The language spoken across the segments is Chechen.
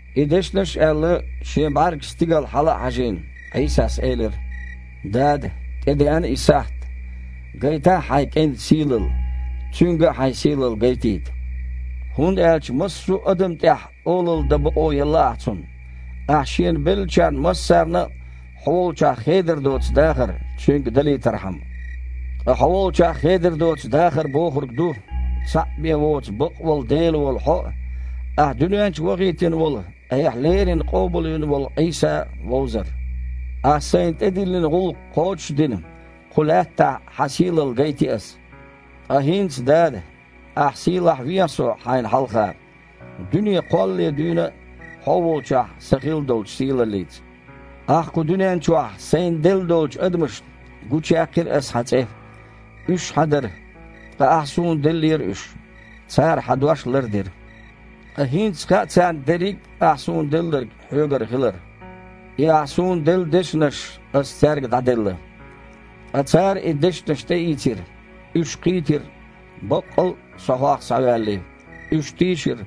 И дешнаш а аьлла, Шен бІаьргаш стигала хьала а хьажийна, Іийсас элира: «Дада! ТІедеана и сахьт. Гайтахьа Хьайн КІентан сийлалла, Цуьнга а Хьайн сийлалла гайтийта. ХІунда аьлча массо а адамна тІехь олалла дан бакъо елла Ахь Цунна, Ахьа Шена беллачарна массарна а Хьо волчохь хедар доцу дахар Цуьнга далийтархьама. Ткъа Хьо волчохь хедар доцу дахар бохург ду: цхьаъ бен воцу бакъволу Дела волу Хьо а, Ахьа дуьнен чу вахийтина волу Айхьа леррина къобалвина волу Іийса а вовзар. Ахьа Сайна тІедиллина гІуллакх кхочуш а дина, кху лаьттахь Хьан сийлалла гайти Ас. Ткъа хІинца, Дада, Ахьа сийлахьвехьа Со Хьайна хьалха, дуьне кхоллале дуьйна а, Хьо волчохь Сан хилла долчу сийлаллица. Ахьа кху дуьнен чохь Сайна делла долчу адамашна, гучуяьккхира Ас Хьан цІе. Уьш Хьан дара, ткъа Ахьа Суна деллера уьш. Цара Хьан дош лардира. Ткъа хІинца хаьа царна дерриг Ахь Суна делларг Хьоьгара хилар. И Ахь Суна делла дешнаш Ас цаьрга дІаделла. Ткъа цара и дешнаш тІеийцира. Уьш кхийтира, баккъал а Со Хьох схьаваьллий. Уьш тийшира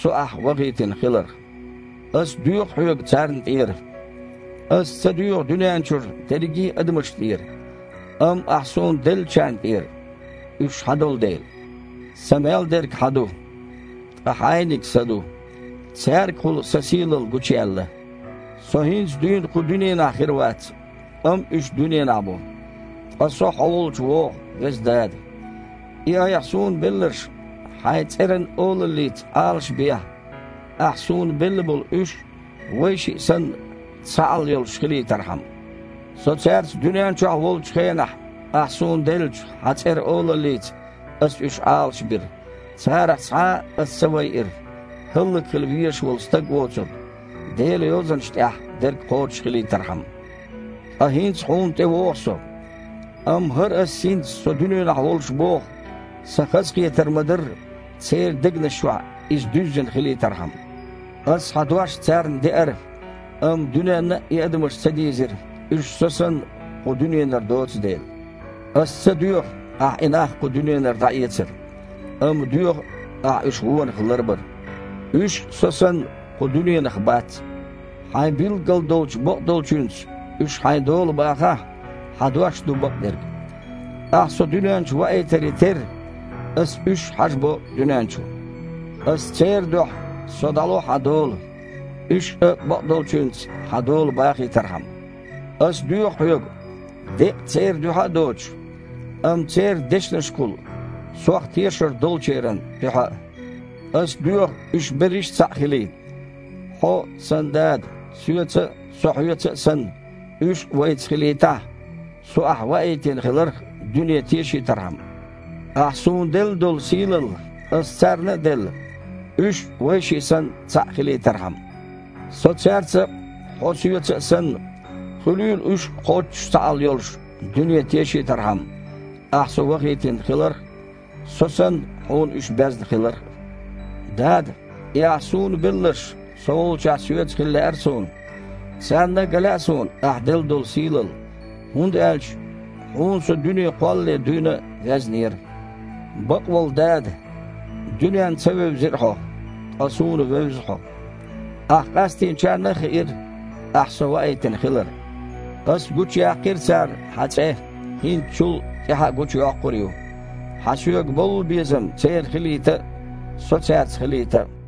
Со Ахьа вахийтина хиларх. Ас доьху Хьоьга царна тІера. Ас ца доьху дуьненарчу дерриге а адамашна тІера, амма Ахь Суна деллачарна тІера, уьш Хьан долу дела. Сан мел дерг Хьан ду, ткъа Хьайниг Сан ду. Цаьргахула Сан сийлалла гучуяьлла. Со хІинца дуьйна кху дуьненахь хир вац, амма уьш дуьненахь бу. Ткъа Со Хьо волчу вогІу. Веза Дада! И Айхьа Суна белларш Хьайн цІеран олаллица Іалашбехьа, Ахьа Суна белла болу уьш а, Вайшиъ санна, цхьаалла йолуш хилийтархьама. Со цаьрца дуьнен чохь волчу хенахь, Ахьа Суна деллачу Хьан цІеран олаллица Ас уьш Іалашбира. Царах цхьа а Ас ца вайира, хІаллакьхила везаш волу стаг воцург, Делан Йозанаш тІехь дерг кхочушхилийтархьама. Ткъа хІинца Хьуна тІевогІу Со. Амма хІара Ас хІинца Со дуьненахь волуш боху, Сан хазахетар ма-дарра, церан дегнаш чохь иза дуьззина хилийтархьама. Ас Хьан дош царна деара, амма дуьненна и адамаш ца дийзира, уьш, Со санна, кху дуьненара доцу дела. Ас ца доьху Ахь и нах кху дуьненара дІаэцар, амма доьху Ахь уьш вонах ларбар. Уьш а, Со санна, кху дуьненах бац. Хьайн билггал долчу бакъдолчуьнца уьш Хьайн дола бахахьа. Хьан дош ду бакъдерг. Ахьа Со дуьнен чу ваийтаре терра, Ас уьш а хьажабо дуьнен чу. Аса церан дуьхьа Со дІало Хьан дола, уьш а бакъдолчуьнца Хьан дола бахийтархьама. Ас доьху Хьоьга, деккъа церан дуьхьа а доцуш, амма церан дешнашкахула Сох тешар долчеран дуьхьа а. Ас доьху уьш берриш цхьаъ хилийта. Хьо, Сан Дада, Соьца а, Со Хьоьца а санна, уьш а Вайца хилийтахь, Со Ахь ваийтина хиларх дуьне тешийтархьама. Ахь Суна делла долу сийлалла Ас царна а делла, уьш а, Вайшиъ санна, цхьаъ хилийтархьама. Со цаьрца а, Хьо Соьца а санна, хуьлийла уьш а кхоччуш цхьаалла йолуш, дуьне тешийтархьама Ахьа Со вахийтина хиларх а, Со санна, Хьуна уьш безна хиларх а. Дада! И Ахь Суна белларш Со волчохь Соьца хила лаьара Суна. Царна а ган лаьа Суна Ахь делла долу сийлалла, хІунда аьлча Хьуна Со дуьне кхоллале дуьйна а везнера. Бакъволу Дада! Дуьненна ца вевзира Хьо, ткъа Суна вевза Хьо. Ахьа къастийначарна а хиира Ахь Со ваийтина хилар. Аса гучуяьккхира царна Хьан цІе, хІинца чул тІаьхьа а гучуйоккхур ю, Хьан Соьга боллу безам церан хилийта а, Со цаьрца хилийта а».